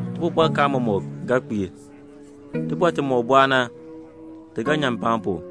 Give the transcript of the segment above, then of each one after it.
Tibɔbɔrkaan mɔmɔk ga kpiir. Tibɔr timɔk bɔɔ na, ti ga nyan mpaan pu.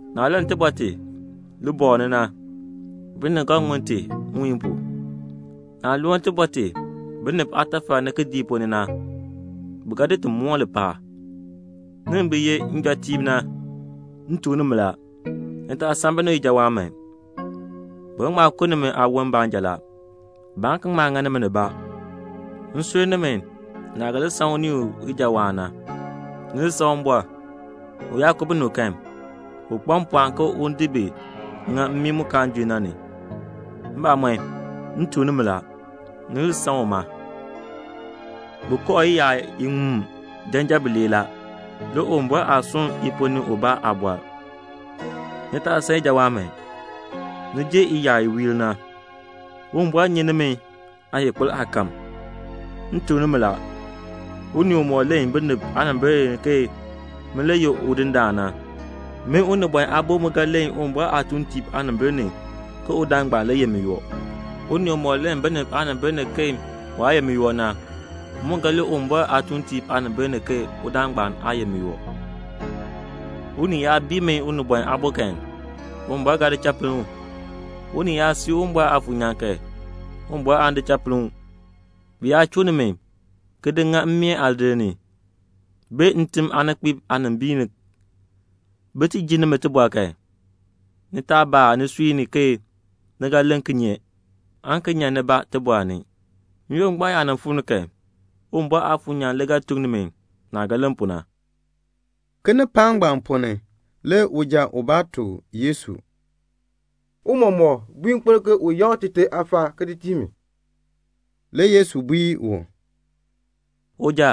Naah len tibɔr ti libɔɔl ni na, binib ga ŋun ti nwiihn pu. Naah loo tibɔr ti binib aatafal ni kidiik ponn ni na, bi ga di ti moon mpaan pu." "Nimi bi ye njɔtiib na, m tuk nimi la, ni taa san binib ijawaan man. Bi ga ŋma ku nimi aawon baanja la. Baan ki ŋma ŋa nimi nibaa. M sur nimi naah ga li san unii u ijawaan na. Ni li san Uwumbɔr. U yaa ku binib kan, u kpa mpɔɔn ke un di bi ŋa mmii mu kaan junn na ni. Mbamɔn, m tuk nimi la, ni li san uma. "Bi kooh iyaar iŋmu janjan mam bilee la. Le Uwumbɔr aa sunn i ponn ni ubaa aabɔr. Ni taa san ijawaan man. Ni jer iyaar i wiir na la. Uwumbɔr nyi nimi aayikpir aakahm." "M tuk nimi la, unii umɔk len binib aanimbil ni ke min le ye Udindaan na, min Unibɔn Aabo mu ga len Uwumbɔr aatuuntiib aanimbil ni ke udaan ngbaan le ye miyoo. Unii umɔk len binib aanimbil ni ke waa ye miyoo na, m mu ga len Uwumbɔr aatuuntiib aanimbil ni ke udaan ngbaan aa ye miyoo. "Unii yaa bii min Unibɔn Aabo kan, Uwumbɔr ga di cha pinn u. Unii yaa sii Uwumbɔr Aafuur nyaan kan, Uwumbɔr aan di cha pinn u. "Bi yaa chuu nimi, ki di ŋa mmeen aadir ni, bee ntim aaninkpiib aanimbiin ni, bin ti ji nimi tibɔr kan, ni taa baa nisui ni ke ni ga len kinye aan ki nyan nibaa tibɔr ni. N-yoonn ngbaan yaa fuu ni kan, Uwumbɔr Aafuur nyaan le ga tuk nimi naah ga len pu na." Kinipaak ngbaan ponn ni le uja ubaa tuk Yesu, "Tiicha, bui nkpil ke un yakr tite aafaal ki di tii mi." Le Yesu bui u, "Uja,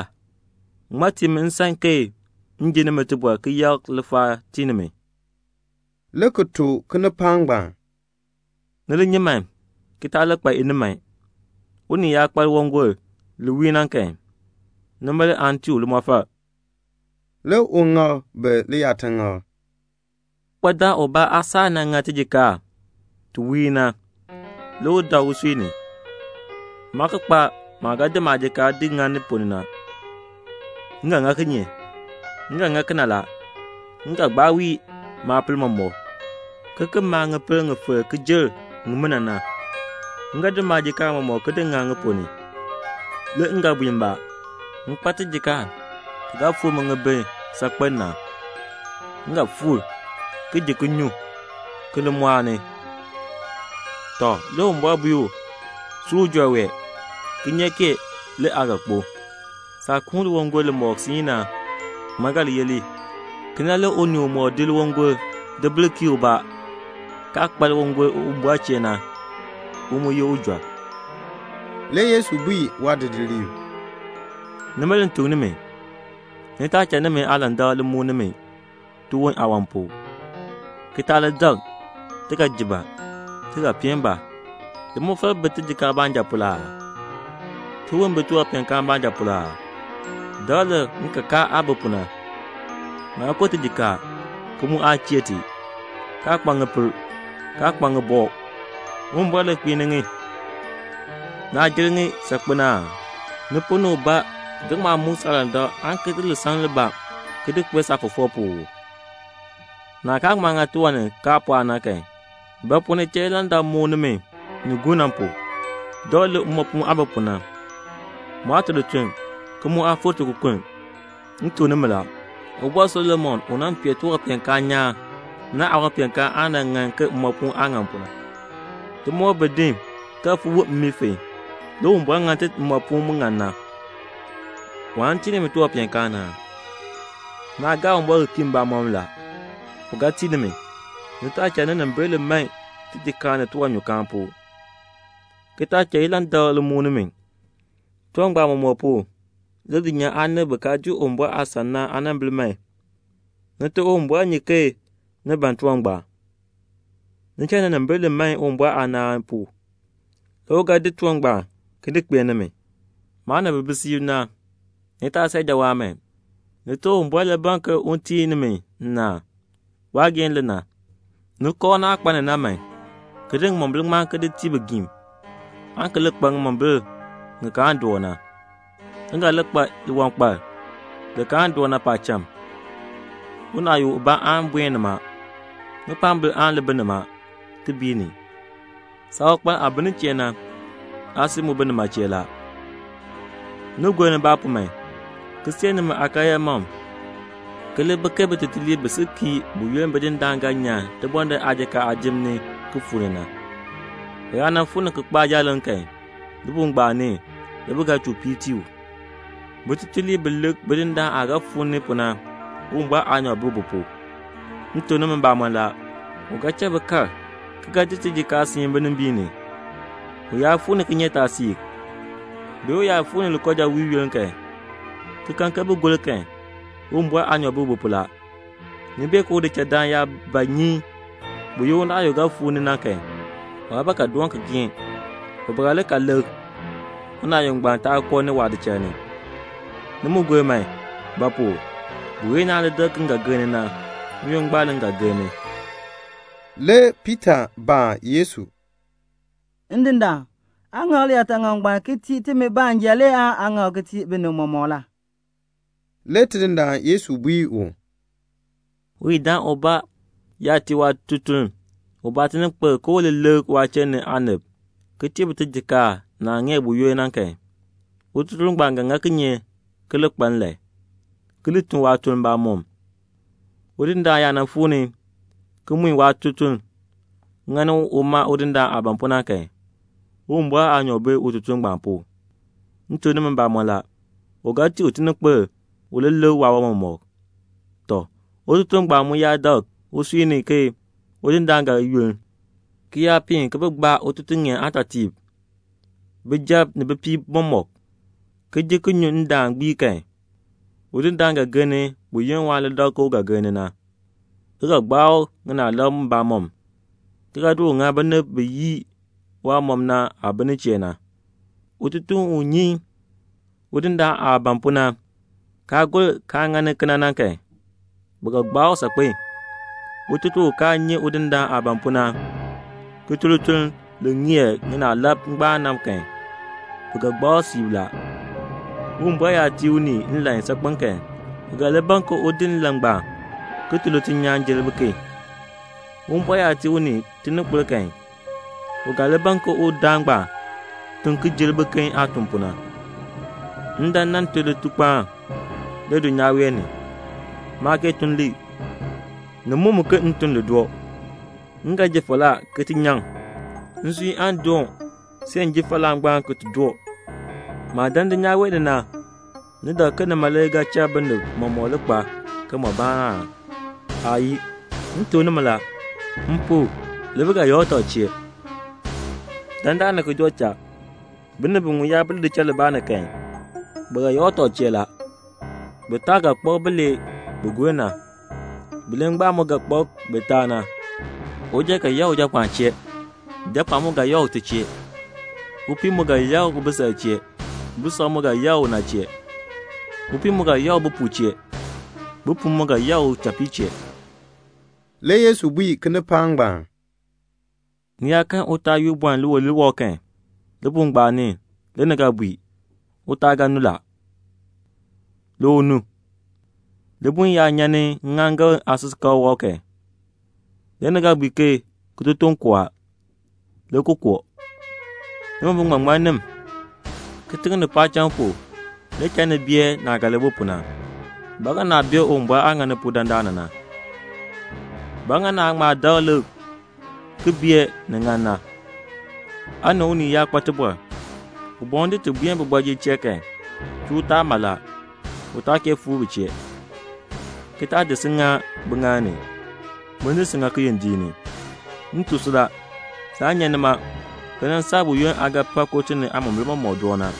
ŋmaa tii mi nsan ke m ji nimi tibɔr ki yakr lifaal ki tii nimi?" le ki tuk kinipaak ngbaan, "Ni li nyi man ki taa li kpa iniman. Unii yaa kpa liwangol li wiir na kan, nima le aan tii u limɔfal." Le u ŋak bi liyaataŋakl, "Uwankpadaan ubaa aasaak nan ŋa tijikaar ti wiir na. Le u dak usui ni, 'Maa ki kpa maah ga di maajikaar di ŋa ni ponn ni na. M ga ŋa kinye? Kena le m ga ŋa; m ga gbaa wii maapil mɔmɔk, ki ki maa ŋipil ŋi filk ki jer ŋimina na. M ga di maajikaar mɔmɔk ki di ŋa ŋi ponn ni. Le m ga bui mbaa, M kpa tijikaar ti ga fuu mi ŋibin saakpen na. M ga fuur, ki ji ki nyu, ki li mɔɔni.' Tɔ, le Uwumbɔr bui u, 'Si ujɔr wee, kinyeek kee le aa ga kpo. Saah kuun liwangol li mɔk na, ŋmaa ga li yeh li?' "Kena le unii umɔk di liwangol di bil kiir ubaa, kaa kpa liwangol Uwumbɔr chee na, u mu ye ujɔr la." Le Yesu bui waadidiliib, "Nima le m tuk nimi, ni taa cha nimi aalandak li muk nimi tiwon aawan pu, ki taa li dak, 'Ti ga ji ba? Ti ga peen ba?' Limɔfal bi tijikaar baanja pu la aa? Tiwon bi tiwanpeenkaan baanja pu la aa? Dakl lik ŋikakaa aah bi pu Ŋaa ko tijikaar, ki mu aa chee ti, kaa kpa ŋipil, kaa kpa ŋibɔk. Uwumbɔr le kpiini ŋi. Naa jer ŋi saakpen aa? Ni ponn ni ubaa ga ŋma muk saalandak aan ki di lisaŋ libaa ki di kpee saafɔfɔk pu uu? Naah kaa ŋma ŋa tiwan ni kaa pɔɔ na kan, ba pu ni cha ilandak li muk nimi ni gur na pu? Dakl lik mmoopuun aah bi pu na. Mu aa tun lituln, ki mu aa fik tikokonn. M tuk nimi la, Ubɔr Solomon u nan pee tiwanpeenkaan nyaan na, waawanpeenkaan aa nan ŋan ke mmoopuun aah ŋan pu na. Timoor bi din ki ga fon see mmii fon, le Uwumbɔr ŋa ti mmoopuun mu ŋan na. Waan tii nimi tiwanpeenkaan aa? Naa gaa Uwumbɔr ki kii mbamɔm. U ga tii nimi. Ni taa cha ninimbil li man tijikaar ni tiwanyukaan pu, ki taa cha ilandak li muk nimi. Tiwan ngbaan mɔmɔk pu le dulnyaa aanib bi kaa dii Uwumbɔr aasan na aanimbil man. Nite Uwumbɔr nyi ke ni ban tiwan ngbaan. Ni cha ninimbil li man Uwumbɔr aanaan pu, le u ga di tiwan ngbaan ki di kpee nimi." "Maanib bi bi siib na, ni taa san ijawaan man. Nite Uwumbɔr le ban ke un tii nimi nnaan. Waageehn le na. Ni kooh naah kpa ni na man, ki di ŋimombil ngbaan ki di tii bigiim, aan ki li kpa ŋimombil ŋi kaan doo na. Ni ga li kpa liwankpal li kaan doo na paacham. Unaayuk ubaa aan buen nima. Ŋikpaambil aan li bi nima ki bii ni. Saawankpal aah bi nin chee na, aasui mu bi nima la." "Ni li gor nibaa man, ki see nimi aakaryaa mam, ki li bi ke bitutuliib bi si kii buyoonn bidindaan ga nyan tibɔndinn aajikaar aajim ni, ki fuu ni na. U yaa fuu ni ki kpaa jaaleŋ kan, libuul ngbaan ni le bi ga chuu piir ki tii u. Bitutuliib bi lik bidindaan aah ga fuu ni na, Uwumbɔr aanyoor bi bi pu la. M tuk nimi mbamɔn la, u ga cha bi kal ki ga di tijikaar siin binimbiin ni. U yaa fuu ni kinyeetaasiik, ke u yaa fuu ni likoojawiil yoonn kan, ki kan ke bi gor kan, Uwumbɔr aanyoor bi bi pu la. Ni bee ke udichaldaan yaa ba nyi buyoonn unaayuk ga fuu ni na kan, waa ba ga doon geen, u ba ga li ka lik, unaayuk ngbaan taa koo waadichal ni. Ni mu li gor man; ba pu? buyoonn naan li dak ke m ga gir ni na, n-yoonn ngbaan le m ga gir ni." Le Piita baa Yesu, "Ndindaan, aa ŋak liyaataŋakl ngbaan ki tii timi baanja le aan aa ŋak ki tii binib mɔmɔk la?" Le Tidindaan Yesu bui u, "Uyidaan ubaa yaa tii waatutuln ubaa tininkpil ke u li lik waachiln ni aanib ki tii bi tijikaar naah ŋeer buyoonn na kan, ututuln ngbaan ga ŋa kinye ki li kpa nlan, ki li tun waatuln mbamɔm? Udindaan yaa fuu ni ki mui waatutuln ŋani uma udindaan aah ban pu na kan, Uwumbɔr aanyoor bi ututuln ngbaan pu. M tuk nimi mbamɔn la, u ga tii u tininkpil u li lik waawan mɔmɔk. Tɔ, ututuln ngbaan mu yaa dak usui ni ke udindaan ga yunn, ki yaa piin ki gbaa ututuŋeen aatɔtiib, bijab ni bipiib mɔk, ki ji ki nyu ndaan gbii kan, le udindaan ga gir ni buyoonn waan li dak ke u ga gir ni na, ki ga gbaa u ŋinaalab mbamɔm, ki ga di u ŋa binib bi yii waamɔb na aah bi nin chee na. "Ututuln u nyi udindaan aah ban pu na, kaa gor kaa ŋani kena na kan, bi ga gbaa u saakpen. Ututuln u kaa nyi udindaan aah ban pu na, ki tun lituln li ŋeer ŋinaalab aagbaan na kan, bi ga gbaa u siib la. Uwumbɔr yaa tii unii nlan saakpen kan, u ga li ban ke un di nlan ngbaan ki tun lituln nyaan jer biken. Uwumbɔr yaa tii unii tininkpil kan, u ga li ban ke udaan ngbaan tun ki jer biken aah tun pu na." "M dan m nan tun litukpaan le dulnyaa wee ni. Maa kee tun li. Ni muk mi ke m tun li doo. M ga ji falaa ki ti nyaŋ. Nsui aan doon see m ji falaa ngbaan ki ti doo. Maah dan dulnyaa wee ni na, ni dak ke nima le ga cha binib mɔmɔk li kpaa kimɔbaan aa? Aayii. M tuk nimi la, m pu le bi ga yakr tɔb chee. Dandana ki joo cha, binib biŋmu yaa bi lidichal libaa ni kan, bi ga yakr tɔb chee la. Bitaa ga kpak bilee bi gur na. Bilee ngbaan mu ga kpak bitaa na. Uja ga yakr ujapɔɔn chee; japɔɔn mu ga yakr ute chee; upii mu ga yakr ubisal chee; bisal mu ga yakr una chee; upii mu ga yakr ubopuu chee; ubopuu mu ga yakr uchapii chee." Le Yesu bui kinipaak ngbaan, "Ni yaa kan utaal yu bɔln liwilir wɔb kan, libuul ngbaan ni le ni ga bui, 'Utaal ga nu la,' le u nu. Libuln yaa nyan ni ŋŋaaŋgan aasikakl wɔb kan, le ni ga bui ke 'Kitotoŋ koo a,' le ki koo. Nimi biŋmaŋmannim, kitiŋ ni paacham pu le cha ni bee naah ga li bi pu na. Ba ŋa naa bee Uwumbɔr aah ŋani pu dandana na?" "Ba ŋa naa ŋma dakl lik ki bee ni ŋan na? Aa ni unii yaa kpa tibɔr, u ban un di ti buen kooti ni kan, chuu utaal mala, waa kee fuu kooti ni, u taa di si ŋa ubɔjir aaŋaal ni, un di si ki ŋa kiyondiik ni. M tuk si la, saan nyan nima ki nan saa buyoonn aa ga pa kooti ni aamombil mɔmɔk na."